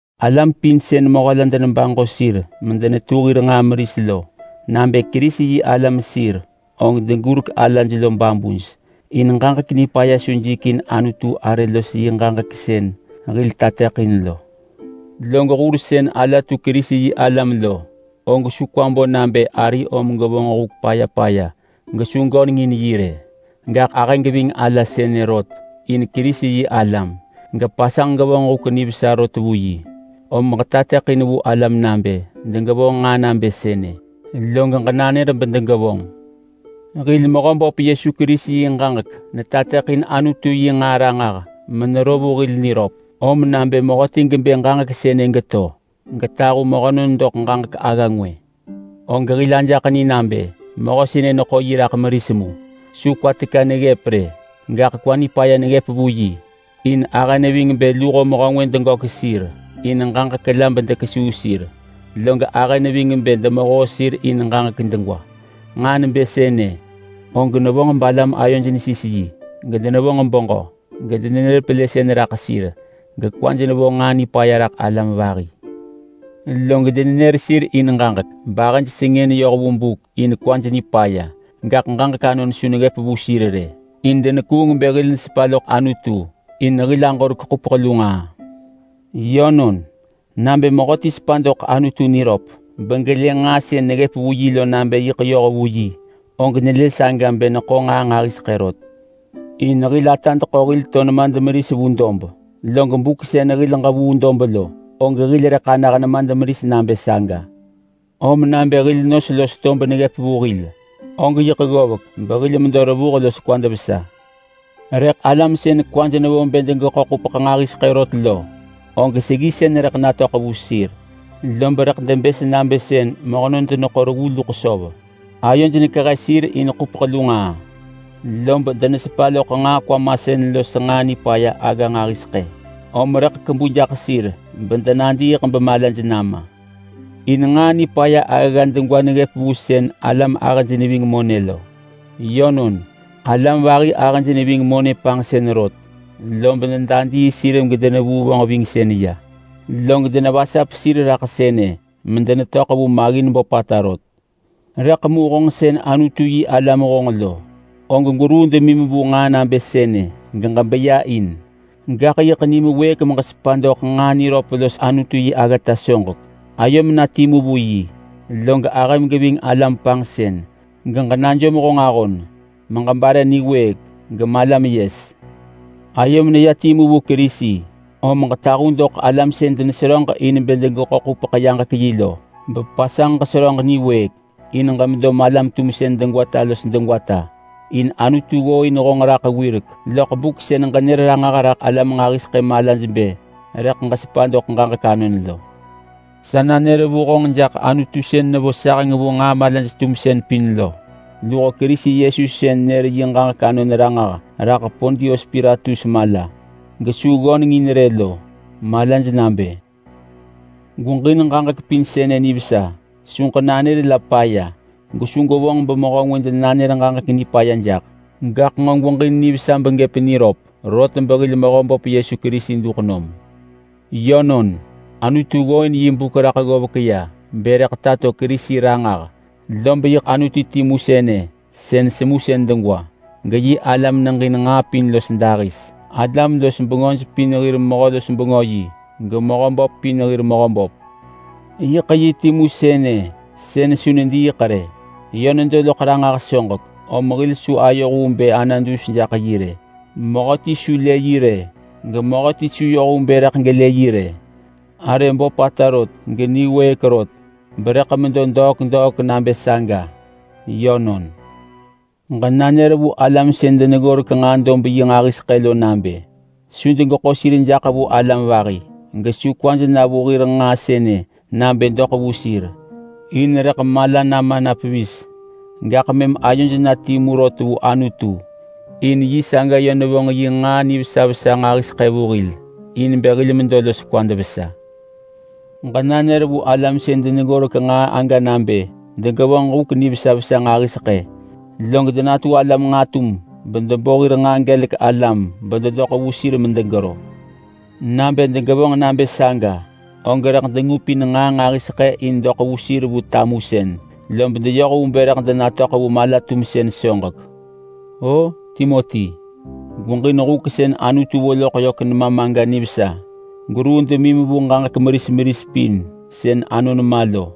Alam pin sën mehö la denebaġo sir medenetu hir nġaa meris lo, nabë Kerisi-yi-alam sir og degurek alaj lo babuj in ġaġek nipaya su jikin Anutu arë los yi ġaġek sën hil nanër lo. Log hur sën alaj detu Kerisi-yi-alam lo, og su kwaj bo nabë arij om degevonġ huk paya paya gesu degöneng in sir rë. Gaḳ ahëj geving alaj sënë rot in Kerisi-yi-alam sir, gepasanġ degevonġ huk nivesa rot vu sir. Om ġetateḳin vu alam nabë degevonġ nġaa nabë sënë, log ġenanër bedegevonġ. Hil Mehöböp Yesu Kerisi yi ġaġek netateḳin Anutu yi nġaa ranġah menero vu hil niröp. Om nabë mehöti gebë ġaġek sënë geto getahu mehönon doḳ ġaġek agga ngwë, og hil ajaḳ ni nabë mehö sënë neḳo yi raḳ meris mu. Su kwa teka neggëp rë, gaḳ kwa nipaya neggëp vu yi. In ahë neving bë luho mehö ngwë degök sir in ġaġek la bedekesuu sir. Log ahë neving bë demehoo sir in ġaġek degwa. Nġaa nebë sënë og nevonġ balam ayoj nesis yi, gedenevonġ beġö, gedenenër pelësën raḳ sir, gekwaj nevo nġaa nipaya raḳ alam vahi. Log denenër sir in ġaġek bahëj sengën yoh vu buk in kwaj nipaya, gaḳ ġaġek anon su neggëp vu sir rë, in denekuung bë hil nesepa loḳ Anutu in hil aġorek ḳupeḳ lu nġaa. Yönon, nabë mehöti sepa doḳ Anutu niröp begelë nġaa sën neggëp vu yi lo nabë yiḳ yoh vu yi, og nelë saga bë neḳo nġaa nġahiseḳë rot. In hil atad ḳo hil los nemad meris vu dob, log buk sën hil ġevuu dob lo, og hil rëḳ anah nemad meris nabë saga. Om nabë hil nos los tob neggëp vu hil, og yiḳ ggovek behil medo revuh los kwad vesa. Rëḳ alam sën kwaj nevo bë degeḳo ḳupeḳ nġahiseḳë rot lo, og seggisën rëḳ natöḳ vu sir, lob rëḳ debës nabë sën mehönon deneḳo reggu luḳ söv. Ayoj nekehe sir in ḳupeḳ lu nġaa, lob denesepa loḳ nġaa kwamasën los nġaa nipaya agga nġahiseḳë, om rëḳ kebu jaḳ sir bedenadiiḳ bemalaj nama. In nġaa nipaya aggagga degwa neggëp vu sën alam ahëj neving monë lo. Yönon, alam vahi ahëj neving monë panġsën rot, lob nedadii sir gedenevuu vonġvingsën ya, log denevasap sir raḳ sënë medenetöḳ vu maggin böpata rot. Rëḳ mu honġ sën Anutu-yi-alam honġ lo, og gweruu demim vu nġaa nabë sënë geġebeya in. Gaḳ yiḳ nim wëëk meġesepa doḳ nġaa niröp los Anutu yi aggata soġek. Ayom na timu vu yi, log ahëm geving alam panġsën. Ġenajom honġ ahon meġebare niwëëk gemalam yes. Ayom neya timu vu Kerisi, om ġetahu doḳ alam sën deneseröġ in bë degeḳo ḳupeḳ-yaġek-yi lo bepasanġ ġeseröġ niwëëk in ġemedo malam-tumsën degwata los degwata. In Anutu ggooin honġ raḳ wirek loḳ buk sën ġenër ranġah raḳ alam nġahiseḳë malaj bë rëḳ ġesepa doḳ ġaġek anon lo. Sa nanër vu honġ jaḳ Anutu sën nevo saheng vu nġaa malaj-tumsën pin lo, luho Kerisi Yesu sën nër yi ġaġek anon ranġah raḳ Pontius Pilatus mala gesu ggöneng in rë lo malaj nabë: Gweġin ġaġek pin sënë nivesa. Su ġenanër la paya, gesu gwevonġ bemehö ngwë denanër ġaġek nipaya jaḳ. Gaḳ nġo gweġin nivesa begëp niröp, rot behil Mehöböp Yesu Kerisi duḳ nom. Yönon, Anutu ggooin yi buk raḳ ggovek ya bë rëḳ tato Kerisi ranġah, lob yiḳ Anutu timu sënë sën semusën degwa geyi ala meneġin nġaa pin los dahis. Alam-los-bengöj pin hir mehö-los-bengö yi, gemehö böp pin hir Mehöböp. Yiḳ yi timu sënë sën su nediiḳ rë. Yö nedo loḳ ranġah soġek, om hil su ayoh vu bë ana dus jaḳ yi rë. Mehöti su lë yi rë, gemehöti su yoh vu bë rëḳ gelë yi rë. Arë böpata rot geniwëëk rot berëḳ medo degwata los degwata nabë saga. Yönon. Ġenanër vu alam sën deneggorek nġaa-dob-yi nġahiseḳë lo nabë su degeḳo sir jaḳ vu alam vahi, gesu kwaj na vu hir nġaa sënë nabë doḳ vu sir, in rëḳ mala nama na pevis. Gaḳ mëm ayoj na timu rot vu Anutu, in yi saga yö nevonġ yi nġaa nivesa vesa nġahiseḳë vu hil in bë hil medo los kwad vesa. Ġenanër vu alam sën deneggorek nġaa aga nabë degevonġ huk nivesa vesa nġahiseḳë, log degevonġ nġatum bedebo hir nġaa gelek alam bededoḳ vu sir medegero. Nabë degevonġ nabë saga, og rëḳ dengupin nġaa nġahiseḳë in doḳ vu sir vu tamusën, lob deyoh vu bë rëḳ denatöḳ vu mala-tumsën soġek. O Timoti, gweġin huk sën Anutu vo loḳ yök nemam aga nivesa. Gweruu demim vu ġaġek meris meris pin sën anon ma lo,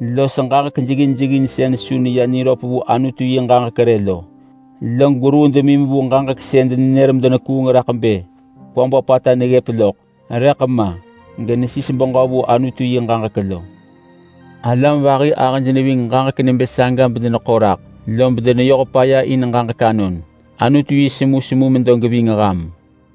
los ġaġek jeggin jeggin sën su neya niröp vu Anutu yi ġaġek rë lo. Log gweruu demim vu ġaġek sën denenër medenekuung raḳ bë kwa böpata neggëp loḳ, rëḳ ma genesis beġö vu Anutu yi ġaġek lo. Alam vahi ahëj neving ġaġek nebë saga bedeneḳo raḳ, lob deneyoh paya in ġaġek anon. Anutu yi semusemu medo geving ham.